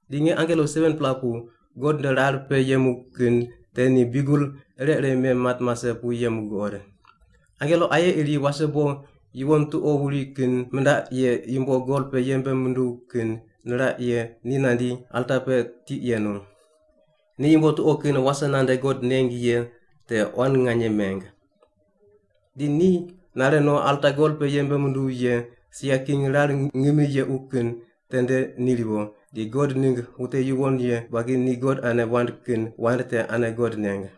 Di nge angelo 7-pela pu God nde rar pe yemu kin te ni biugel ire ire mem mat mase pu yemu guqod. Angelo aye iri wasebo yuwon tuqo wuri kin mindaq ye yumbo gol pe yembe munduw kin niraq ye ni nandi alta pe tiq yenu. Ni yumbo tuqo kin wase nande God neng ye te quan nganye meng. Di ni nare no alta gol pe yembe munduw ye sia king rar ngimi yequ kin tende ni riwo, di God ningg wute yuwon ye buagi ni God ane wand kin wand te ane God neng.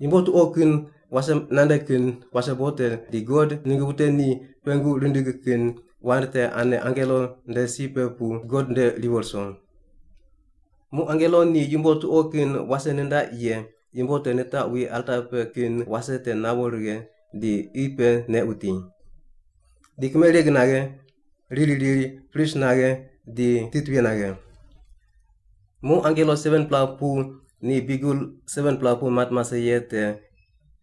Yumbo tuqo kin wase nande kin wasebo te di God ningg wute ni God pengu rindig kin wand te ane angelo nde si pe pu God nde riwo ruso. Muq angelo ni yumbo tuqo kin wase nindaq ye yumbo te nitaqwi alta pe kin wase te nawo righe di qi pe neq wuti. Di kimereg naghe, riri riri, pris naghe, di titwuye naghe. Muq angelo 7-pela pu ni biugel 7-pela pu mat mase ye te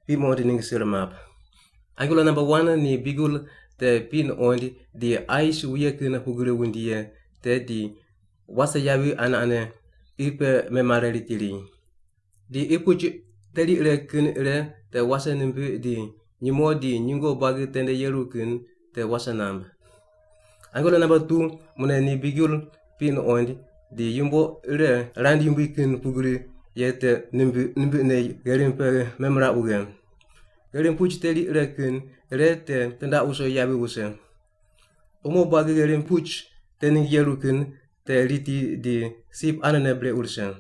piq muqond ningg sir map. Angelo namba wan ni biugel te piq nuqoind di ais wuye kin pugri wundi ye te di wase yavi ane ane qi pe memare riti ri. Di qi puch teri ire kin ire te wase nimbiq di nyumo di nyungo buagi tende yeru kin te wase namb. Angelo namba tu mune ni biugel piq nuqoind, di yumbo ire rand yumbui kin pugri ye te nimbiq nimbiqne gherim pe memiraq wughe. Gherim puch teri ire kin ire te tindaq wuso yavi wuse. Umo buagi gherim puch te ningg yeru kin te riti di sip anene brequ rise.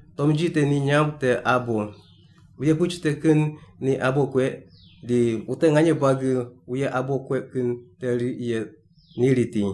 Tomnji te ni nyamb te “Abo.” Wuye puch te kin ni abo kueq di wute nganye buagi wuye abo kueq kin te riq ye ni riti.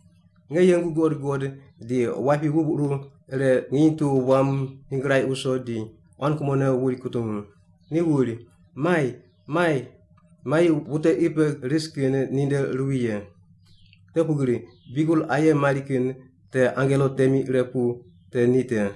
Nge yengu guqod guqod di wapi wubquru ire nginy tu wam nyingraiq wuso di quan kumone wuri kutungu. Ni wuri, “Mai! Mai! Mai wute qi pe ris kin ninde ruwi ye. Te pugri biugel aye mari kin te angelo temi ire pu te ni te.”